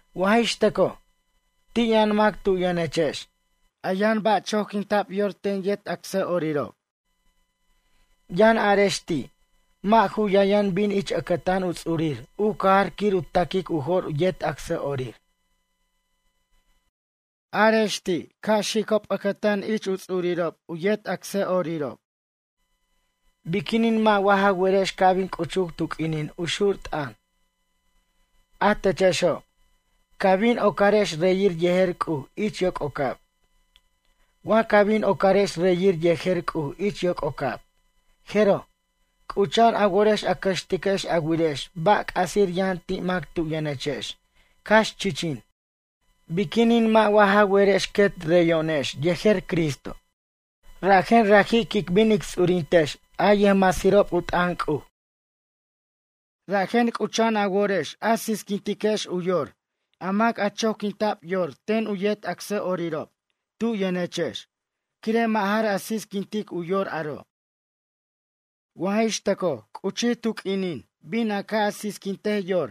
Wa jix tʌcoj, ti' yʌn mac tu' yʌnechex, a yʌn ba' choquinta'b yor ten yet acsa'orirob. Yʌn arex ti', mʌ' ju yʌn yʌn bin ich ʌcʌtan u ts'urir u cajar quir u ta'quic u jo'r yet acsa'orir. Arex ti', ca' xicob ʌcʌtan ich u ts'urirob u yet acsa'orirob. Biquinin mʌ' wa ja werex ca' bin c'uchuc tu q'uinin u xur t'ʌn, a techexo', ca bin ocarex reyir yejer C'uj ich yoc'ocab. Wa ca bin ocarex reyir yejer C'uj ich yoc'ocab, jeroj, c'ucha'an a worex a cʌxtiquex a wirex ba' c'asir yʌn ti' mac tu' yʌnechex cax chichin. Biquinin mʌ' wa ja werex quet reyo'onex yejer Cristo, rajen raji' quic bin ic ts'urintex a yʌjmasirob u t'ʌn C'uj. Rajen c'ucha'an a worex a sisquintiquex u yor a mac a choquinta'b yor yet acsa'orirob tu' yʌnechex quire' mʌ' jar a sisquintic yor aro'. Wa jix tʌcoj c'uchur tu q'uinin bin a ca' a sisquintej yor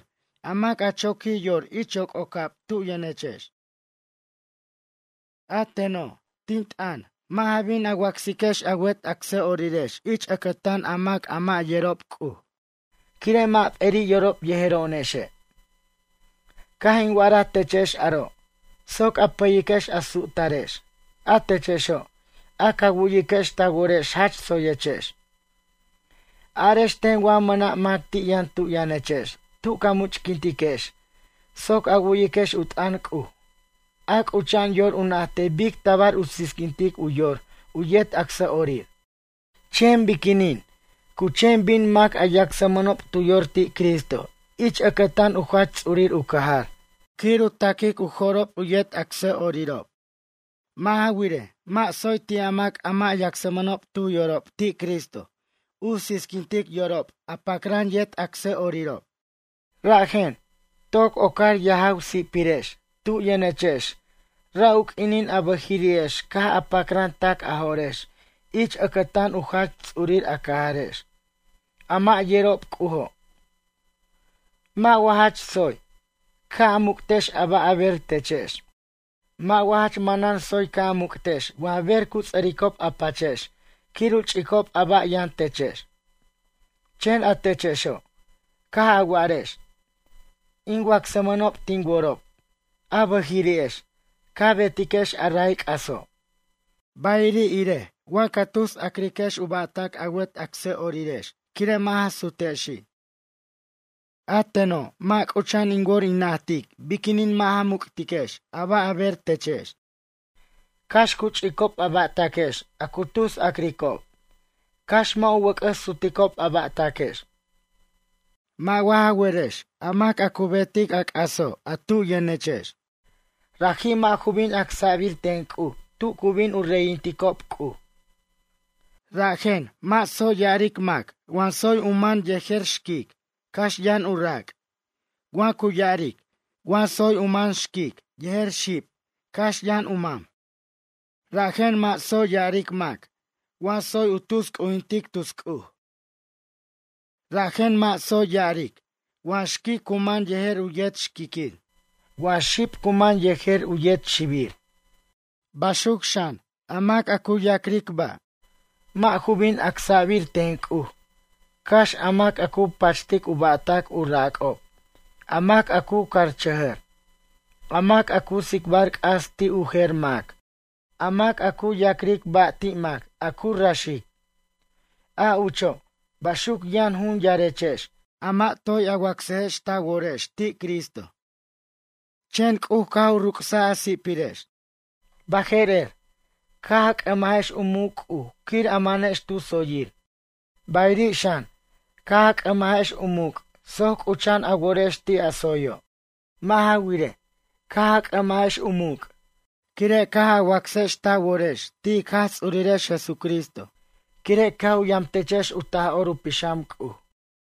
mac a choquij yor ich yococab tu' yʌnechex. A teno', tin t'ʌn, mʌ' ja bin a yacsiquex a wet acsa'orirex ich ʌcʌtan a mac a mʌ' yerob C'uj, quire' mʌ' p'eri' yorob yejero'onexe'. Caj in wa'araj techex aro' soc a pʌyiquex a su'tarex, a techexo', a ca wu'yiquex ta worex jach tsoyechex. Arex ten wa mʌna' mac ti' yʌn tu' yʌnechex tu ca much'quintiquex soc a wu'yiquex u t'ʌn C'uj, a c'ucha'an yor u najtej bic tabar u sisquintic u yor u yet acsa'orir? Chen biquinin cu chen bin mac a yacsmʌnob tu yor ti' Cristo ich ʌcʌtan u jach ts'urir u cajar quir u ta'quic u jo'rob u yet acsa'orirob? Mʌ' ja wirej, mʌ' tsoy ti' a mac a mʌ' yacsmʌnob tu yorob ti' Cristo u sisquintic yorob a pacran yet acsa'orirob. Rajen, toc ocar yajaw si'pirex tu' yʌnechexex ra' u q'uinin a bʌjiri'ex caj a pacran tac a jo'rex ich ʌcʌtan u jach ts'urir a cajarex, a mʌ' yerob C'ujo'. Mʌ' wa jach tsoy, ca' a muc'tex a ba' a ber techex? Mʌ' wa jach manan tsoy ca' a muc'tex wa ber cu ts'ʌricob a pachex quir u ch'icob a ba' yʌn techex? Chen a techexo', caj a wa'arex: “In wacsmʌnob tin worob”, a bʌjiri'ex, ca betiquex a ray c'aso'. Bayiri' irej wa ca tus a'criquex u ba'tac a wet acsa'orirex quire' mʌ' ja sutexi'. A teno', mʌ' c'ucha'an in wor in najtic biquin mʌ' ja muc'tiquex a ba' a ber techex, cax cu ch'icob a ba'taquex a cu tus a'cricob cax mʌ' u wʌc'ʌs suticob a ba'taquex. Mʌ' wa ja werex a mac a cu betic a c'aso' a tu yʌnechex, raji' mʌ' ju bin acsa'bir ten C'uj tu cu bin u reyinticob C'uj. Rajen, mʌ' tsoy ya'aric mac wa tsoy u man yejer xquic, cax yʌn u rac', wa cu ya'aric, wa tsoy u man xquic yejer xib, cax yʌn u man. Rajen mʌ' tsoy ya'aric mac wa tsoy u tus c'ujintic tus c'uj. Rajen mʌ' tsoy ya'aric, wa xquic u man yejer u yet xquiquir, wa xib cu man yejer u yet xibir. Baxuc xan, a mac a cu ya'cric ba', mʌ' ju bin acsa'bir ten C'uj, cax a mac a cu pachtic u ba'tac u rac'ob, a mac a cu carchʌjʌr, a mac a cu tsicbar c'as ti' u jer mac, a mac a cu ya'cric ba' ti' mac a cu raxic. A ucho', baxuc yʌn jun yarechex, a mʌ' toy a wacsajex ta worex ti' Cristo. Chen C'uj caj u ruc's a si'pirex. Baje'rer, caj a c'ʌmajex u muc' C'uj quir a manex tu tsoyir. Bayiri' xan, caj a c'ʌmajex u muc' soc c'ucha'an a worex ti' a tsoyo'. Mʌ' ja wirej, caj a c'ʌmajex u muc', quire' caj a wacsex ta worex ti' ic Jaj Ts'urirex Jesucristo, quire' caj u yamtechex u Taj'or u Pixam C'uj.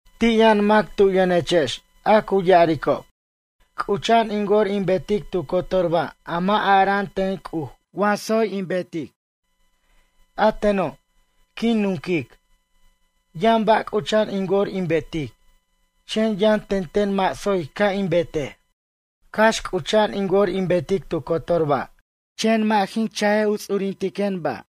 Ti' yʌn mac tu yʌnechex a cu ya'aricob: “C'ucha'an in wor in betic tu cotor ba' a mʌ' ara'an ten C'uj wa tsoy in betej.” A teno', quin nunquic, yʌn ba' c'ucha'an in wor in betic, chen yʌn tenten mʌ' tsoy ca' in betej. Cax c'ucha'an in wor in betic tu cotor ba', chen mʌ' jin cha' in ts'urintejen ba'.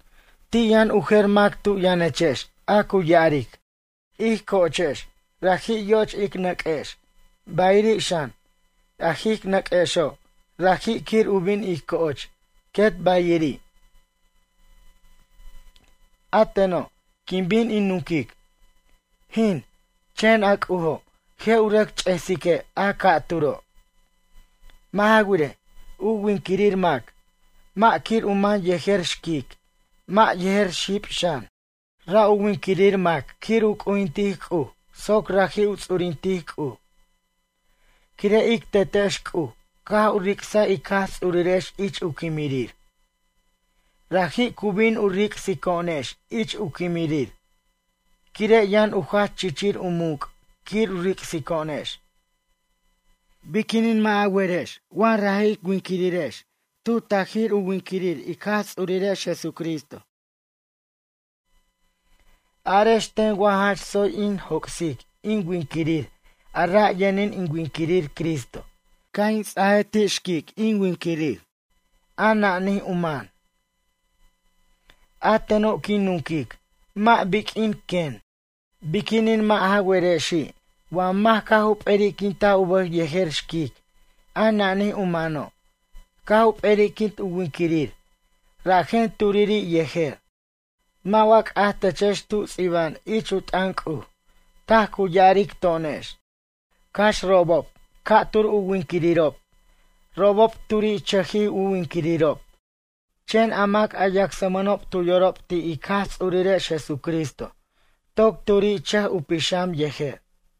Ti' yʌn u jer mac tu yʌnechex a cu ya'aric: “Ij co'ochex raji' yo'och ic nʌq'uex, bayiri' xan, a ij nʌq'uexo' raji' quir u bin ij co'och, quet bayiri'.” A teno', quin bin in nunquic: “Jin, chen a C'ujo' je' u rʌc ch'esique' a ca'turo'.” Mʌ' ja wirej, u winquirir mac, mʌ' quir u man yejer xquic, mʌ' yer xib xan. Ra' u winquirir mac quir u c'ujintic C'uj soc raji' u ts'urintic C'uj. Quire' ic Tetex C'uj caj u ric'saj ic Jaj Ts'urirex ich u quimirir. Raji' cu bin u ric'sico'onex ich u quimirir, quire' yʌn u jach chichir u muc' quir u ric'sico'onex. Biquinin mʌ' ja werex wa raji' ic winquirirex tu tajir u winquirir ic Jaj Ts'urirex Jesucristo. Arex ten wa jach tsoy in joc'sic in winquirir a ra' yʌnin in winquirir Cristo, ca' in ts'aj ti' xquic in winquirir, a nanij u man? A teno' quin nunquic, mʌ' biq'uin quen. Biquinin mʌ' ja werexi' wa mac caj u p'er'quintaj u bʌj yejer xquic a nanij u mano', caj u p'er'iquint u winquirir, rajen turiri' yejer. Mʌ' wa c'aj techex tu ts'iba'an ich u t'ʌn C'uj, taj cu ya'aric to'onex: “Cax robob ca'tur u winquirirob, robob turiri'chʌj u winquirirob.” Chen a mac a yacsmʌnob tu yorob ti' ic Jaj Ts'urirex Jesucristo toc turiri'chʌj u pixam yejer.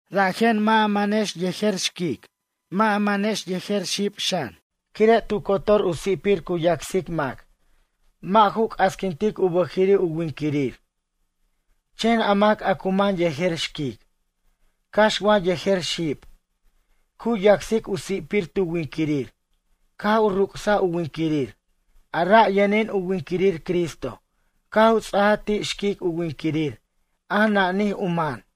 Rajen mʌ' ja manex yejer xquic, mʌ' a manex yejer xib xan, quire' tu cotor u si'pir cu yacsic mac, mʌ' ju c'asquintic u bʌjiri' u winquirir. Chen a mac a cu man yejer xquic, cax wa yejer xib, cu yacsic u si'pir tu winquirir caj u ruc'saj u winquirir, a ra' yʌnin u winquirir Cristo caj u ts'aj ti' xquic u winquirir a nanij u man.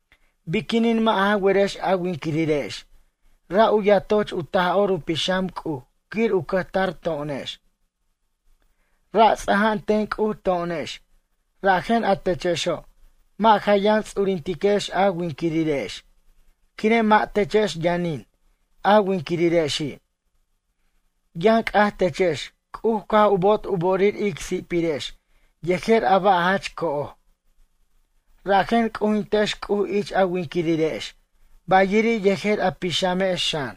Biquinin mʌ' ja werex a winquirirex ra' u yatoch u Taj'or u Pixam C'uj quir u cʌjtar to'onex. Ra' ts'aja'an ten C'uj to'onex, rajen a techexo' mʌ' ja yʌn ts'urintiquex a winquirirex, quire' mʌ' techex yʌnin a winquirirexi'. Yʌn c'aj techex C'uj caj u bo'ot u bo'orir ic si'pirex yejer a ba' jach co'oj. Rajen c'ujintex C'uj ich a winquirirex, bayiri' yejer a pixamex xan.